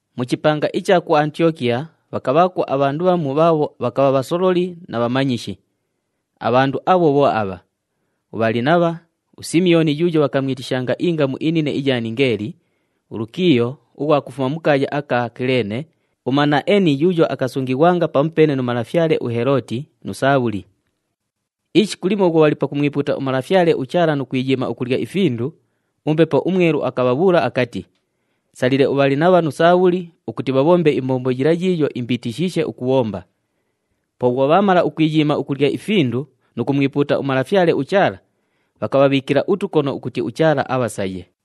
Mu chipanga icha ku Antiyokiya bhakabhaakwo abhandu bhamu bhaabho bhakabha bhasololi na bhamanyishi. Abhandu abho bho abha: uBhalinabha, uSimiyooni yuuyo bhakamwitishanga ingamu inine iya Ningeeli, uLukiiyo ughwa kufuma mu kaaya aka Kileene, uManaeni yuuyo akasungighwanga pamupeene nu malafyale uHelooti, nu Saabhuli. Ishiku limo bhwo bhali pakumwipuuta uMalafyale uChaala nu kwiyiima ukulya ifindu, uMbepo uMwelu akabhabhuula akati, “Salile uBhalinabha nu Saabhuli ukuti bhabhombe imbombo yila yiiyo imbiitishiishe ukubhomba.” Po bhwo bhaamala ukwiyiima ukulya ifindu nu kumwipuuta uMalafyale uChaala, bhakabhabhiikila utukono ukuti uChaala abhasaye.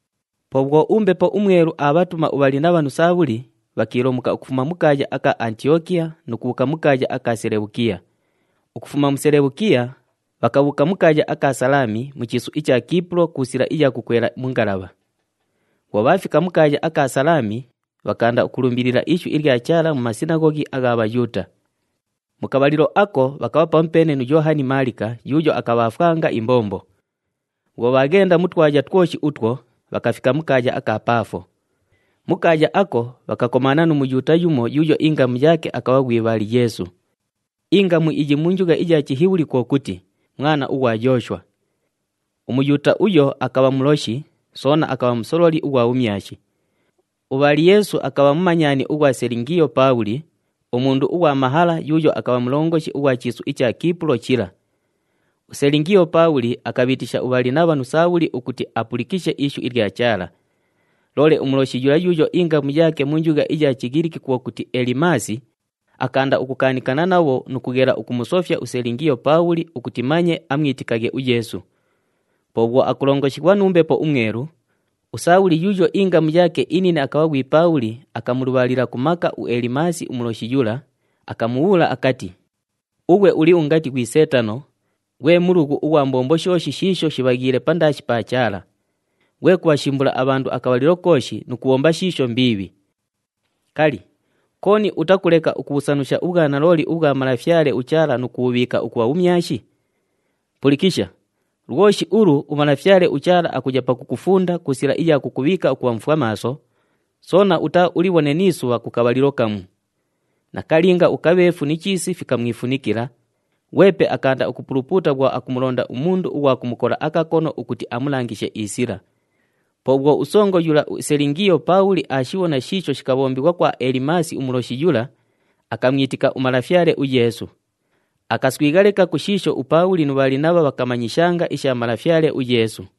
Po bhwo uMbepo uMwelu aabhatuma uBhalinabha nu Saabhuli, bhakiilomuka ukufuma mu kaaya aka Antiyokiya nu kubhuuka mu kaaya aka Selebhukiya. Ukufuma mu Selebhukiya, bhakabhuuka mu kaaya aka Salaami mu chiisu icha Kiipulo ku sila iya kukwela mu ngalabha. Bhwo bhaafika mu kaaya aka Salaami, bhakaanda ukulumbilila ishu ilya Chaala mu masinaghoghi agha Bhayuuta. Mu kabhalilo ako, bhakabha pamupeene nu Yoohani Maalika yuuyo akabhaafwanga imbombo. Bhwo bhaaghenda mu twaya twoshi utwo, bhakafika mu kaaya aka Paafo. Mu kaaya ako, bhakakomaana nu Muyuuta yumo yuuyo ingamu yaake akabha ghwi Bhali-Yeesu. Ingamu iyi mu njugha iya Chihibhuli kwo kuti, “Mwana ughwa Yooshwa.” UMuyuuta uyo akabha muloshi, soona akabha musololi ughwa bhumyashi. UBhali-Yeesu akabha mumanyani ughwa Selingiyo Paabhuli, umundu ughwa mahala yuuyo akabha mulongoshi ughwa chiisu icha Kiipulo chila. USelingiyo Paabhuli akabhiitisha uBhalinabha nu Saabhuli ukuti apulikishe ishu ilya Chaala. Loole umuloshi yula yuuyo ingamu yaake mu njugha iya Chighiliki kwo kuti, Elimaasi, akaanda ukukaanikana nabho nu kughela ukumusofya uSelingiyo Paabhuli ukuti manye amwitikaghe uYeesu. Po bhwo akulongoshighwa nu Mbepo uMwelu, uSaabhuli yuuyo ingamu yaake inine akabha ghwi Paabhuli akamulubhaalila ku maka uElimaasi umuloshi yula, akamubhuula akati, “Ughwe uli ungati ghwi Seetano, ghwe mulughu ughwa mbombo shooshi shiisho shibhaghiile pandaashi pa Chaala! Ghwe kubhashimbula abhandu akabhalilo kooshi nu kubhomba shiisho mbiibhi. Kali, kooni utakuleka ukubhusanusha ubhwanalooli ubhwa Malafyale uChaala nu kubhubhiika ukubha bhumyashi? Pulikisha, lwoshi ulu uMalafyale uChaala akuya pakukufunda ku sila iya kukubhiika ukubha mufwamaaso, soona utaaulibhone ni isubha ku kabhalilo kamu.” Nakalinga, ukabheefu ni chiisi fikamwifunikila, ghwepe akaanda ukupulupuuta bhwo akumulonda umundu ughwa kumukola akakono ukuti amulangishe isila. Po bhwo usongo yula uSelingiyo Paabhuli aashibhona shiisho shikabhombighwa kwa Elimaasi umuloshi yula, akamwitika uMalafyale uYeesu. Akaswigha leka ku shiisho uPaabhuli nu Bhalinabha bhakamanyishanga isha Malafyale uYeesu.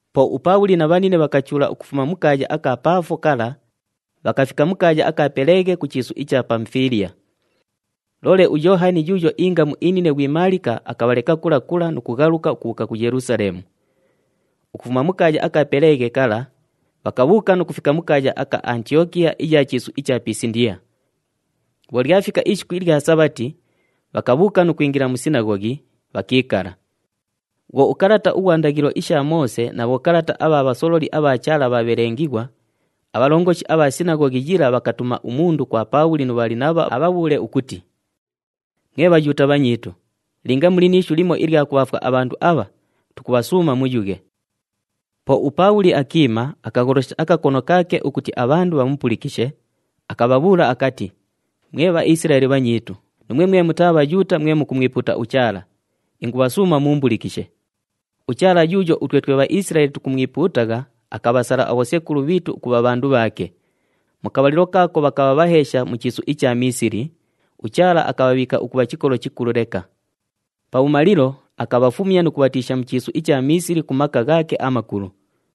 Po uPaabhuli na bhanine bhakachuula ukufuma mu kaaya aka Paafo kala, bhakafika mu kaaya aka Peleghe ku chiisu icha Pamufiiliya. Loole uYoohani yuuyo ingamu inine ghwi Maalika akabhaleka kula kula nu kughaluka ukubhuuka ku Yelusaleemu. Ukufuma mu kaaya aka Peleghe kala, bhakabhuuka nu kufika mu kaaya aka Antiyokiya iya chiisu icha Pisindiya. Bhwo lyafika ishiku ilya Sabhati, bhakabhuuka nu kwingila mu sinaghoghi, bhakiikala. Bhwo ukalata ughwa ndaghilo isha Moose na bhokalata abha bhasololi abha Chaala bhaabhelengighwa, abhalongoshi abha sinaghoghi yila bhakatuma umundu kwa Paabhuli nu Bhalinabha abhabhuule ukuti, “Mwe Bhayuuta bhanyiitu, linga muli ni ishu limo ilya kubhaafwa abhandu abha, tukubhasuuma muyughe.” Po uPaabhuli akiima, akagholosha akakono kaake ukuti abhandu bhamupulikishe, akabhabhuula akati, “Mwe Bhaisilaeli bhanyiitu, nuumwe mwe mutaa Bhayuuta mwe mukumwipuuta uChaala, ingubhasuuma muumbulikishe. UChaala yuuyo utwe twe Bhaisilaeli tukumwipuutagha akabhasala abhosekulu bhiitu ukubha bhandu bhaake. Mu kabhalilo kaako bhakabha bhaheesha mu chiisu icha Miisili, uChaala akabhabhiika ukubha chikolo chikulu leka. Pabhumalilo, akabhafumya nu kubhatiisha mu chiisu icha Miisili ku maka ghaake amakulu.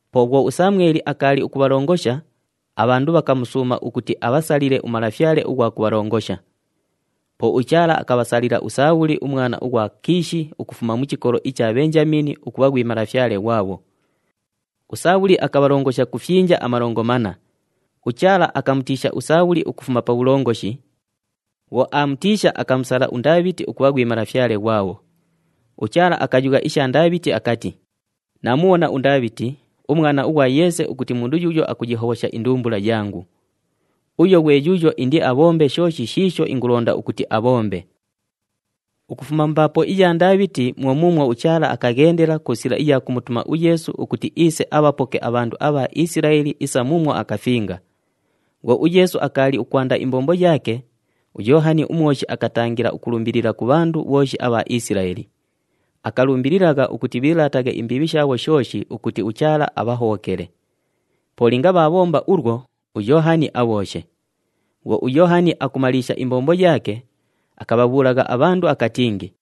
Po bhwo uSamweli akaali akubhalongosha, abhandu bhakamusuuma ukuti abhasalile umalafyale ughwa kubhalongosha. Po uChaala akabhasalila uSaabhuli umwana ughwa Kiishi ukufuma mu chikolo icha Bhenjamiini ukubha ghwi malafyale ghwabho. USaabhuli akabhalongosha ku fyinja amalongo manna. UChaala akamutiisha uSaabhuli ukufuma pa bhulongoshi. Bhwo aamutiisha, akamusala uNdaabhiti ukubha ghwi malafyale ghwabho. UChaala akayugha isha Ndaabhiti akati, ‘Naamubhona uNdaabhiti, umwana ughwa Yeese ukuti mundu yuuyo akuyihobhosha indumbula yangu. Uyo ghwe yuuyo indiabhombe shooshi shiisho ingulonda ukuti abhombe.’ “Ukufuma mu mbaapo iya Ndaabhiti mwo muumwo uChaala akaghendela ku sila iya kumutuma uYeesu ukuti iise abhapoke abhandu abha Isilaeli isa muumwo akafinga. Bhwo uYeesu akaali ukwanda imbombo yaake, uYoohani uMwoshi akatangila ukulumbilila ku bhandu bhooshi abha Isilaeli. Akalumbililagha ukuti bhiilaataghe imbiibhi shaabho shooshi ukuti uChaala abhahobhokele. Po linga bhaabhomba ulwo, uYoohani abhooshe. Bhwo uYoohani akumaliisha imbombo yaake, akabhabhuulagha abhandu akatingi,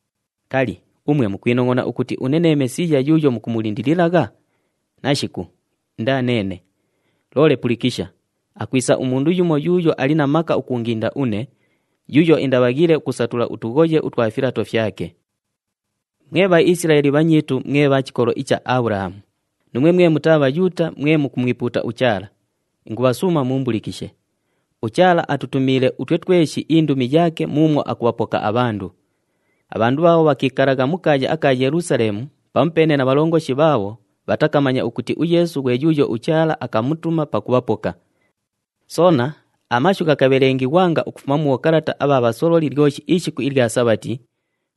‘Kali, umwe mukwinongʼona ukuti une nee Mesiiya yuuyo mukumulindililagha? Nashiku, indaa neene. Loole pulikisha, akwisa umundu yumo yuuyo ali na maka ukuunginda une, yuuyo indabhaghiile ukusatula utughoye utwa filato fyake.’ “Mwe Bhaisilaeli bhanyiitu mwe bha chikolo icha Abhulahamu, nuumwe mwe mutaa Bhayuuta mwe mukumwipuuta uChaala, ingubhasuuma muumbulikishe! UChaala atutumiile utwe tweshi indumi yaake muumwo akubhapoka abhandu. Abhandu bhaabho bhakiikalagha mu kaaya aka Yelusaleemu pamupeene na bhalongoshi bhaabho bhatakamanya ukuti uYeesu ghwe yuuyo uChaala akamutuma pakubhapoka. Soona, amashu ghakabhelengighwanga ukufuma mu bhokalata abha bhasololi lyoshi ishiku ilya Sabhati,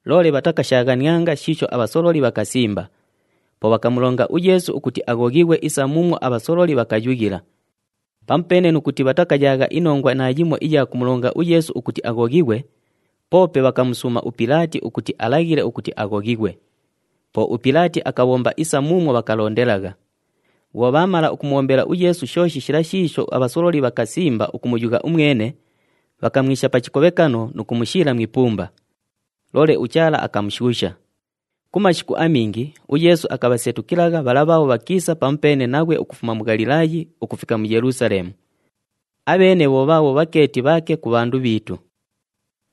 loole bhatakashaaghanianga shiisho abhasololi bhakasimba. Po bhakamulonga uYeesu ukuti aghoghighwe isa muumwo abhasololi bhakayughila. Pamupeene nu kuti bhatakayaagha inongwa naayimo iya kumulonga uYeesu ukuti aghoghighwe, poope bhakamusuuma uPilaati ukuti alaghile ukuti aghoghighwe. Po uPilaati akabhomba isa muumwo bhakalondelagha. Bhwo bhaamala ukumubhombela uYeesu shooshi shila shiisho abhasololi bhakasimba ukumuyugha umwene, bhakamwisha pa chikobhekano nu kumushiila mu ipumba. Loole uChaala akamushuusha. Ku mashiku amingi uYeesu akabhasetukilagha bhala bhaabho bhakiisa pamupeene naghwe ukufuma mu Ghalilaayi ukufika mu Yelusaleemu. Abheene bho bhaabho bhakeeti bhaake ku bhandu bhiitu.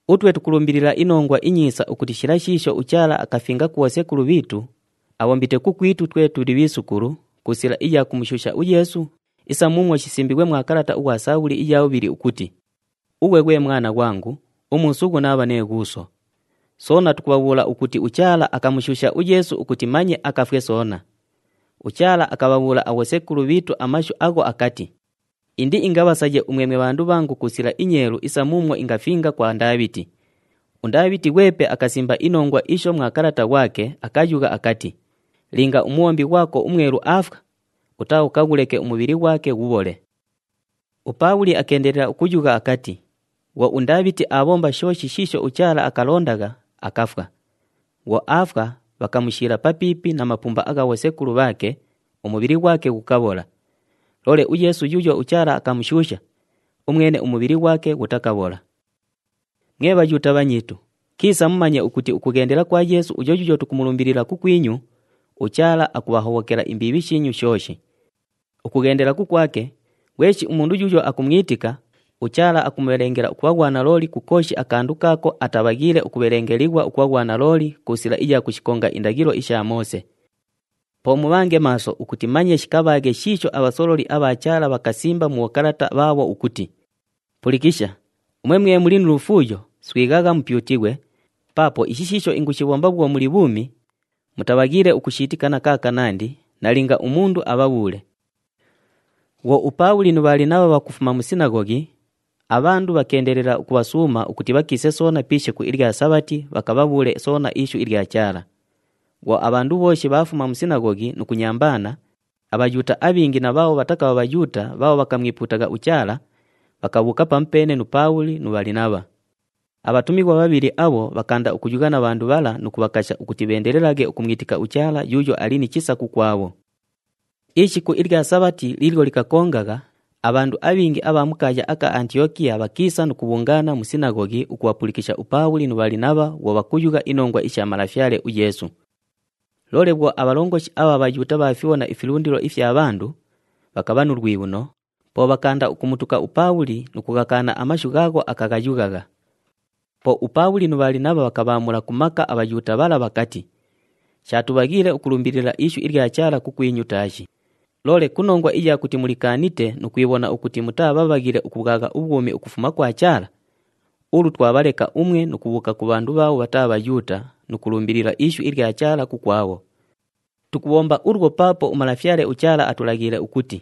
“Utwe tukulumbilila iNongwa iNyiisa ukuti shila shiisho uChaala akafinga ku bhosekulu bhiitu, abhombite kukwitu twe tuli bhiisukulu, ku sila iya kumushuusha uYeesu, isa muumwo shisimbiighwe mwa kalata ughwa Sabhuli iya bhubhili, ukuti, ‘Ughwe ghwe mwana ghwangu, umuusughu naabha nee Ghuuso.’ “Soona tukubhabhuula ukuti uChaala akamushuusha uYeesu ukuti manye akafwe soona. UChaala akabhabhuula abhosekulu bhiitu amashu agho akati, ‘Indiingabhasaye umwe mwe bhandu bhangu ku sila inyeelu isa muumwo ingafinga kwa Ndaabhiti.’ “UNdaabhiti ghwepe akasimba inongwa isho mwa kalata ghwake, akayugha akati, ‘Linga umubhombi ghwako uMwelu aafwa, utaaukaghuleke umubhili ghwake ghubhole.’” UPaabhuli akeendelela ukuyugha akati, “Bhwo uNdaabhiti aabhomba shooshi shiisho uChaala akalondagha, akafwa. Bhwo aafwa, bhakamushiila papiipi na mapumba agha bhosekulu bhaake, umubhili ghwake ghukabhola. Loole uYeesu yuuyo uChaala akamushuusha, umwene umubhili ghwake ghutakabhola. “Mwe Bhayuuta bhanyiitu, kiisa mumanye ukuti ukughendela kwa Yeesu uyo yuuyo tukumulumbilila kukwinyu, uChaala akubhahobhokela imbiibhi shiinyu shooshi. Ukughendela kukwake, ghweshi umundu yuuyo akumwitika, uChaala akumubhelengela ukubha ghwanalooli ku kooshi akandu kaako atabhaghiile ukubhelengelighwa ukubha ghwanalooli ku sila iya kushikonga indaghilo isha Moose. Po mubhange maaso ukuti manye shikabhaaghe shiisho abhasololi abha Chaala bhakasimba mu bhokalata bhaabho ukuti, ‘Pulikisha, umwe mwe muli nu lufuuyo, swighagha, mupyutighwe, paapo ishi shiisho ingushibhomba bhwo muli bhuumi, mutabhaghiile ukushiitika na kaakanandi, nalinga umundu abhabhuule.’” Bhwo uPaabhuli nu Bhalinabha bhakufuma mu sinaghoghi, abhandu bhakeendelela ukubhasuuma ukuti bhakiise soona pi ishiku ilya Sabhati bhakabhabhuule soona ishu ilya Chaala. Bhwo abhandu bhooshi bhaafuma mu sinaghoghi nu kunyambaana, aBhayuuta abhingi na bhaabho bhatakabha Bhayuuta bhaabho bhakamwipuutagha uChaala, bhakabhuuka pamupeene nu Paabhuli nu Bhalinabha. Abhatumighwa bhabhili abho bhakaanda ukuyugha na bhandu bhala nu kubhakasha ukuti bheendelelaghe ukumwitika uChaala yuuyo ali ni chisa kukwabho. Ishiku ilya Sabhati liilyo likakongagha, abhandu abhingi abha mu kaaya aka Antiyokiya bhakiisa nu kubhungaana mu sinaghoghi ukubhapulikisha uPaabhuli nu Bhalinabha bhwo bhakuyugha inongwa isha Malafyale uYeesu. Loole bhwo abhalongoshi abha Bhayuuta bhaafibhona ifilundilo ifya bhandu, bhakabha nu lwibhuno, po bhakaanda ukumutuka uPaabhuli nu kughakaana amashu ghaagho akaghayughagha. Po uPaabhuli nu Bhalinabha bhakabhaamula ku maka aBhayuuta bhala bhakati, “Shaatubhaghiile ukulumbilila ishu ilya Chaala kukwinyu taashi. Loole ku nongwa iya kuti mulikaanite nu kwibhona ukuti mutaa bhabhaghile ukubhwagha ubhwumi ukufuma kwa Chaala, ulu twabhaleka umwe nu kubhuuka ku bhandu bhaabho bhataa Bhayuuta nu kulumbilila ishu ilya Chaala kukwabho. Tukubhomba ulwo paapo uMalafyale uChaala atulaghiile ukuti,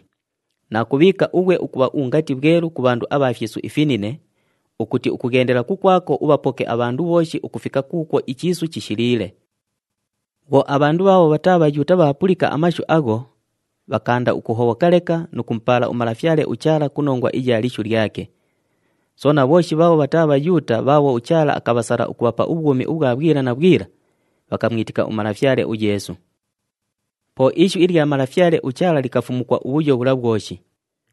‘Naakubhiika ughwe ukubha ungati bhwelu ku bhandu abha fyisu ifinine, ukuti ukughendela kukwako ubhapoke abhandu bhooshi ukufika kuukwo ichiisu chishiliile.’” Bhwo abhandu bhaabho bhataa Bhayuuta bhaapulika amashu agho, bhakaanda ukuhobhoka leka nu kumupaala uMalafyale uChaala ku nongwa iya lishu lyake. Soona bhooshi bhaabho bhataa Bhayuuta bhaabho uChaala akabhasala ukubhapa ubhwumi ubhwa bhwila na bhwila, bhakamwitika uMalafyale uYeesu. Po ishu ilya Malafyale uChaala likafumukwa ubhuyo bhula bhwoshi.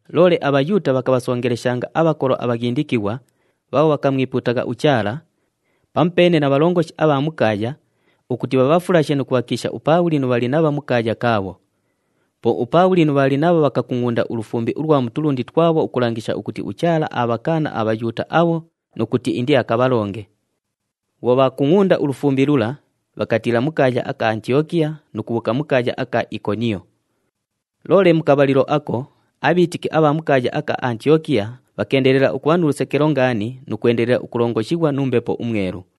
Loole aBhayuuta bhakabhasongeleshanga abhakolo abhaghindikighwa, bhaabho bhakamwipuutagha uChaala, pamupeene na bhalongoshi abha mu kaaya, ukuti bhabhafulashe nu kubhakiisha uPaabhuli nu Bhalinabha mu kaaya kaabho. Po uPaabhuli nu Bhalinabha bhakakungʼunda ulufumbi ulwa mu tulundi twabho ukulangisha ukuti uChaala aabhakaana aBhayuuta abho nu kuti indiakabhalonge. Bhwo bhaakungʼunda ulufumbi lula, bhakatiila mu kaaya aka Antiyokiya nu kubhuuka mu kaaya aka Ikoniyo. Loole mu kabhalilo ako, abhiitiki abha mu kaaya aka Antiyokiya bhakeendelela ukubha nu lusekelo ngaani nu kwendelela ukulongoshighwa nu Mbepo uMwelu.